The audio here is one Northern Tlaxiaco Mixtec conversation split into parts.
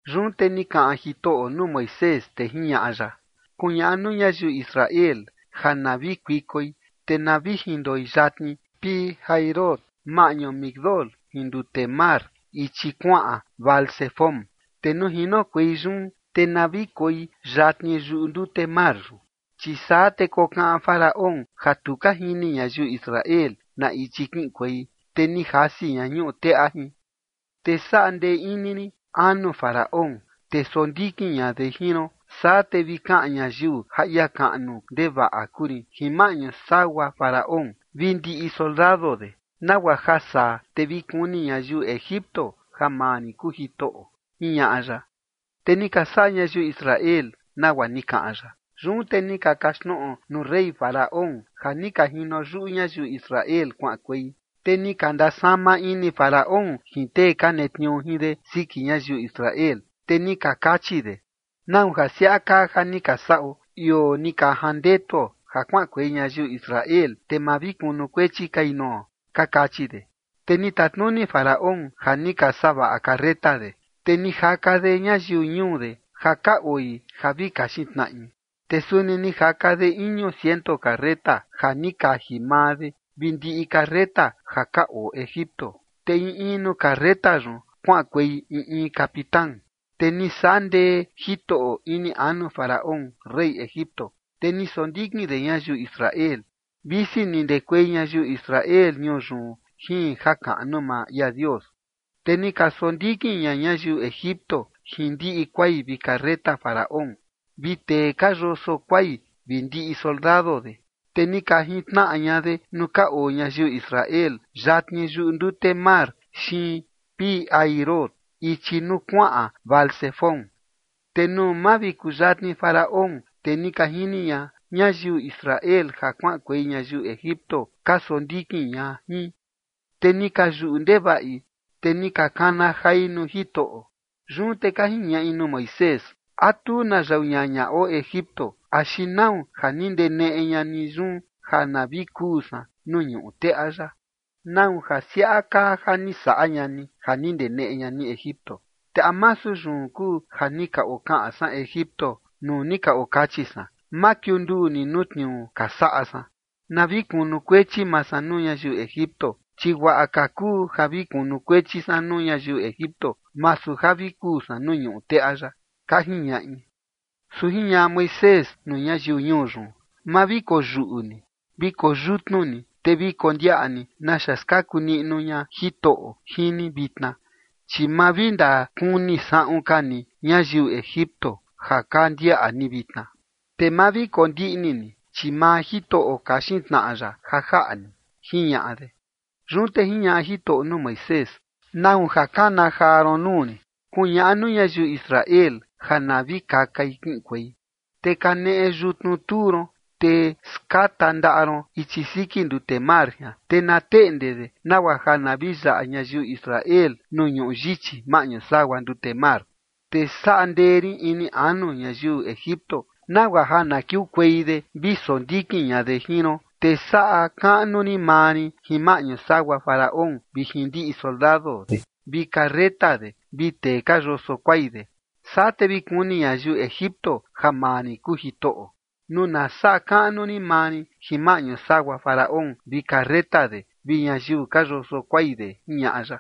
Yun te ni kaꞌan Jitoꞌo nuu Moisés, te jiñaꞌa ya: ―Kuñaꞌa nuu ñayiu Israel ja na vi kuikoi, te na vi jindoi yatni Pi-hahirot, maꞌñu Migdol jin ndute mar, ichi kuaꞌan Baal-zefón. Te nuu jinokuei yun, te na vi koi yatni yuꞌu ndute mar yun. Chi saa te kokaꞌan Faraón ja tu ka jini ñayiu Israel na ichi kiꞌinkuei, te ni jasi ña ñuꞌu teꞌa jin. Te saꞌa ndee rin ini anu Faraón, te sondikin ña de jin ron, saa te vi kaꞌan ñayiu ja ia kaꞌnu ndevaꞌa kuu rin jin maꞌñu sagua Faraón vi ndiꞌi soldado de, nagua ja saa te vi kuni ñayiu Egipto ja maa rin kuu Jitoꞌo ―jiñaꞌa ya. Te ni ka saꞌa ñayiu Israel nagua ni kaꞌan ya. Yun te ni ka kaxtnoꞌo nuu rey Faraón ja ni ka jino yuꞌu ñayiu Israel kuaꞌankuei, te ni ka ndasama ini Faraón jin tee ka netniuu jin de siki ñayiu Israel, te ni ka kachi de: ―¿Nau ja siaꞌa kaa ja ni ka saꞌo ioo ni ka jandetuo ja kuaꞌankuei ñayiu Israel, te ma vi kunukuechi kai nuo? ―ka kachi de. Te ni tatnuni Faraón ja ni ka savaꞌa carreta de, te ni jaka de ñayiu ñuu de ja ka oi ja vi kaxin tnaꞌi. Te suni ni jaka de iñu ciento carreta ja ni kaji maa de vi ndiꞌi carreta ja ka oo Egipto, te in in nuu carreta yun kuaꞌankuei in in capitán. Te ni saꞌa ndee Jitoꞌo ini anu Faraón, rey Egipto, te ni sondikin de ñayiu Israel, visi ni ndekuei ñayiu Israel ñuu yun jin jakaꞌnu maa ia Dios. Te ni ka sondikin ña ñayiu Egipto jin ndiꞌi kuai vi carreta Faraón, vi tee ka yoso kuai vi ndiꞌi soldado de, te ni ka jintnaꞌa ña de nuu ka oo ñayiu Israel yatni yuꞌu ndute mar xiin Pi-hahirot, ichi nuu kuaꞌan Baal-zefón. Te nuu mavikuyatni Faraón, te ni ka jini ña ñayiu Israel ja kuaꞌankuei ñayiu Egipto ka sondikin ña jin, te ni ka yuꞌu ndevaꞌi, te ni ka kana jai nuu Jitoꞌo. Yun te ka jiñaꞌi nuu Moisés: ―¿A tu na yau ñaña oo Egipto, axi nau ja ni ndeneꞌe ña ni yun ja na vi kuu san nuu ñuꞌu teꞌa yaꞌa? ¿Nau ja siaꞌa kaa ja ni saꞌa ña ni ja ni ndeneꞌe ña ni Egipto? Te ¿a masu yun kuu ja ni ka okaꞌan san Egipto nuu ni ka okachi san: “Ma kiunduu ni nuu tniuu ka saꞌa san. Na vi kunukuechi maa san nuu ñayiu Egipto, chi guaꞌa ka kuu ja vi kunukuechi san nuu ñayiu Egipto, masu ja vi kuu san nuu ñuꞌu teꞌa yaꞌa”? ―ka jiñaꞌi. Su jiñaꞌa Moisés nuu ñayiu ñuu yun: ―Ma vi koyuꞌu ni. Vi koyutnu ni, te vi kondiaꞌa ni naxa skaku niꞌnu ña Jitoꞌo jin ni vitna, chi ma vi ndakuni saꞌun ka ni ñayiu Egipto ja ka ndiaꞌa ni vitna. Te ma vi kondiꞌni ni, chi maa Jitoꞌo kaxin tnaꞌa ya ja jaꞌa ni ―jiñaꞌa de. Yun te jiñaꞌa Jitoꞌo nuu Moisés: ―¿Nau ja kana jaa ron nuu rin? Kuñaꞌa nuu ñayiu Israel ja na vi kakai kiꞌinkuei. Te kaneꞌe yutnu tuu ron, te skata ndaꞌa ron ichi siki ndute mar jian, te na teꞌnde de nagua ja na vi yaꞌa ñayiu Israel nuu ñuꞌu yichi maꞌñu sagua ndute mar. Te saꞌa ndee rin ini anu ñayiu Egipto nagua ja na kiukuei de vi sondikin ña de jin ron, te saꞌa kaꞌnu rin maa rin jin maꞌñu sagua Faraón vi jin ndiꞌi soldado de vi carreta de vi tee ka yoso kuai de. Saa te vi kuni ñayiu Egipto ja maa rin kuu Jitoꞌo, nuu na saꞌa kaꞌnu rin maa rin jin maꞌñu sagua Faraón vi carreta de vi ñayiu ka yoso kuai de ―jiñaꞌa ya.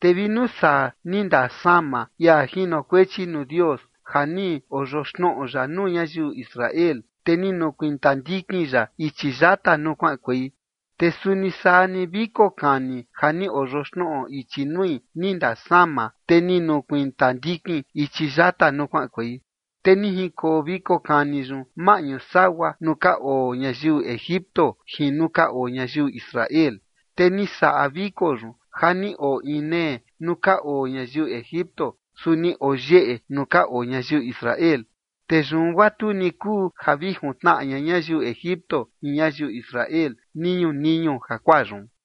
Te vi nuu saa ni ndasama ia jinokuechi nuu Dios ja ni oyoxnoꞌo ya nuu ñayiu Israel, te ni nukuiin tandikin ya ichi yata nuu kuaꞌankuei. Te suni saa ni viko kani ja ni oyoxnoꞌo ichi nui ni ndasama, te ni nukuiin tandikin ichi yata nuu kuaꞌankuei. Te ni jinkoo viko kani yun maꞌñu sagua nuu ka oo ñayiu Egipto jin nuu ka oo ñayiu Israel. Te ni saꞌa viko yun ja ni oo inee nuu ka oo ñayiu Egipto, su ni oo yeꞌe nuu ka oo ñayiu Israel. Te yun guaa tu ni kuu ja vi juntnaꞌa ña ñayiu Egipto jin ñayiu Israel niñu niñu jakuaa yun.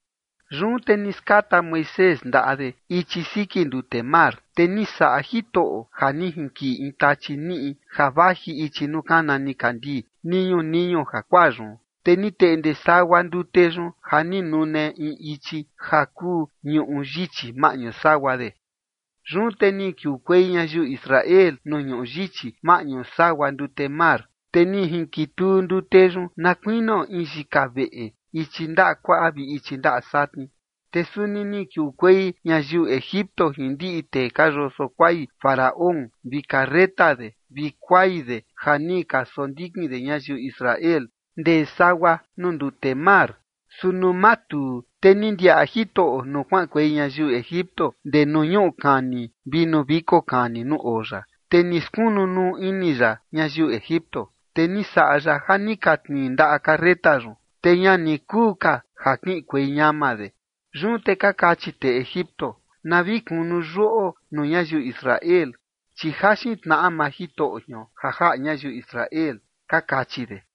Yun te ni skata Moisés ndaꞌa de ichi siki ndute mar, te ni saꞌa Jitoꞌo ja ni jinkiꞌi in tachi niꞌi ja vaji ichi nuu kana nikandii niñu niñu jakuaa yun. Te ni teꞌnde sagua ndute yun ja ni nune in ichi ja kuu ñuꞌu yichi maꞌñu sagua de. Yun te ni kiukuei ñayiu Israel nuu ñuꞌu yichi maꞌñu sagua ndute mar, te ni jinkituu ndute yun na kuinio in yika veꞌe ichi ndaꞌa kuaꞌa vi ichi ndaꞌa satni. Te suni ni kiukuei ñayiu Egipto jin ndiꞌi tee ka yoso kuai Faraón vi carreta de vi kuai de ja ni ka sondikin de ñayiu Israel ndee sagua nuu ndute mar. Su nuu matuu, te ni ndiaꞌa Jitoꞌo nuu kuaꞌankuei ñayiu Egipto ndee nuu ñuꞌu kani vi nuu viko kani nuu oo ya, te ni skunu nuu ini ya ñayiu Egipto. Te ni saꞌa ya ja ni ka tnii ndaꞌa carreta yun, te ña ni kuu ka ja kiꞌinkuei ñama de. Yun te ka kachi tee Egipto: ―Na vi kunu yuꞌo nuu ñayiu Israel, chi jaxin tnaꞌa maa Jitoꞌo jion ja jaꞌa ñayiu Israel ―ka kachi de.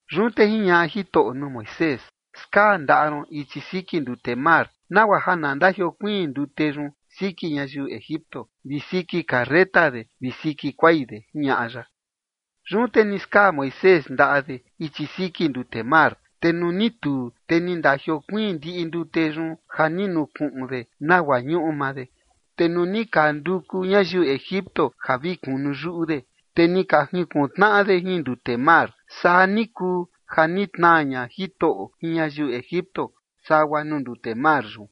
Yun te jiñaꞌa Jitoꞌo nuu Moisés: ―Skaa ndaꞌa ron ichi siki ndute mar, nagua ja na ndajiokuiin ndute yun siki ñayiu Egipto vi siki carreta de vi siki kuai de ―jiñaꞌa ya. Yun te ni skaa Moisés ndaꞌa de ichi siki ndute mar, te nuu ni tuu, te ni ndajiokuiin ndiꞌi ndute yun ja ni nukuꞌun de nagua ñuꞌu maa de. Te nuu ni ka nduku ñayiu Egipto ja vi kunu yuꞌu de, te ni ka junkuntnaꞌa de jin ndute mar. Saa ni kuu ja ni tnaa ña Jitoꞌo jin ñayiu Egipto sagua nuu ndute mar yun.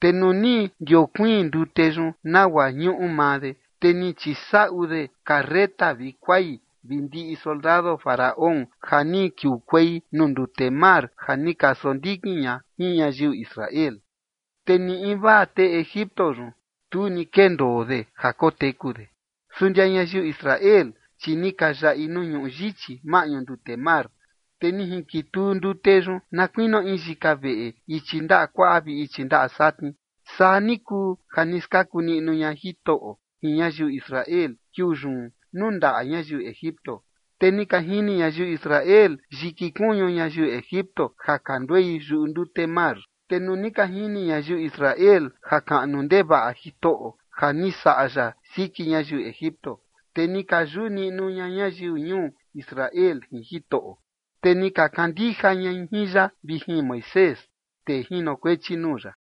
Te nuu ni ndiokuiin ndute yun nagua ñuꞌu maa de, te ni chisaꞌu de carreta vi kuai vi ndiꞌi soldado Faraón ja ni kiukuei nuu ndute mar ja ni ka sondikin ña jin ñayiu Israel. Te ni invaa tee Egipto yun, tu ni kendoo de ja koteku de. Su ndia ñayiu Israel, chi ni ka yaꞌi nuu ñuꞌu yichi maꞌñu ndute mar, te ni jinkituu ndute yun na kuinio in yika veꞌe ichi ndaꞌa kuaꞌa vi ichi ndaꞌa satni. Saa ni kuu ja ni skaku niꞌnu ña Jitoꞌo jin ñayiu Israel kiuu yun nuu ndaꞌa ñayiu Egipto. Te ni ka jini ñayiu Israel yiki kuñu ñayiu Egipto ja ka nduei yuꞌu ndute mar yun. Te nuu ni ka jini ñayiu Israel jakaꞌnu ndevaꞌa Jitoꞌo ja ni saꞌa ya siki ñayiu Egipto, te ni ka yuꞌu niꞌnu ña ñayiu ñuu Israel jin Jitoꞌo, te ni ka kandija ñai jin ya vi jin Moisés, tee jinokuechi nuu ya.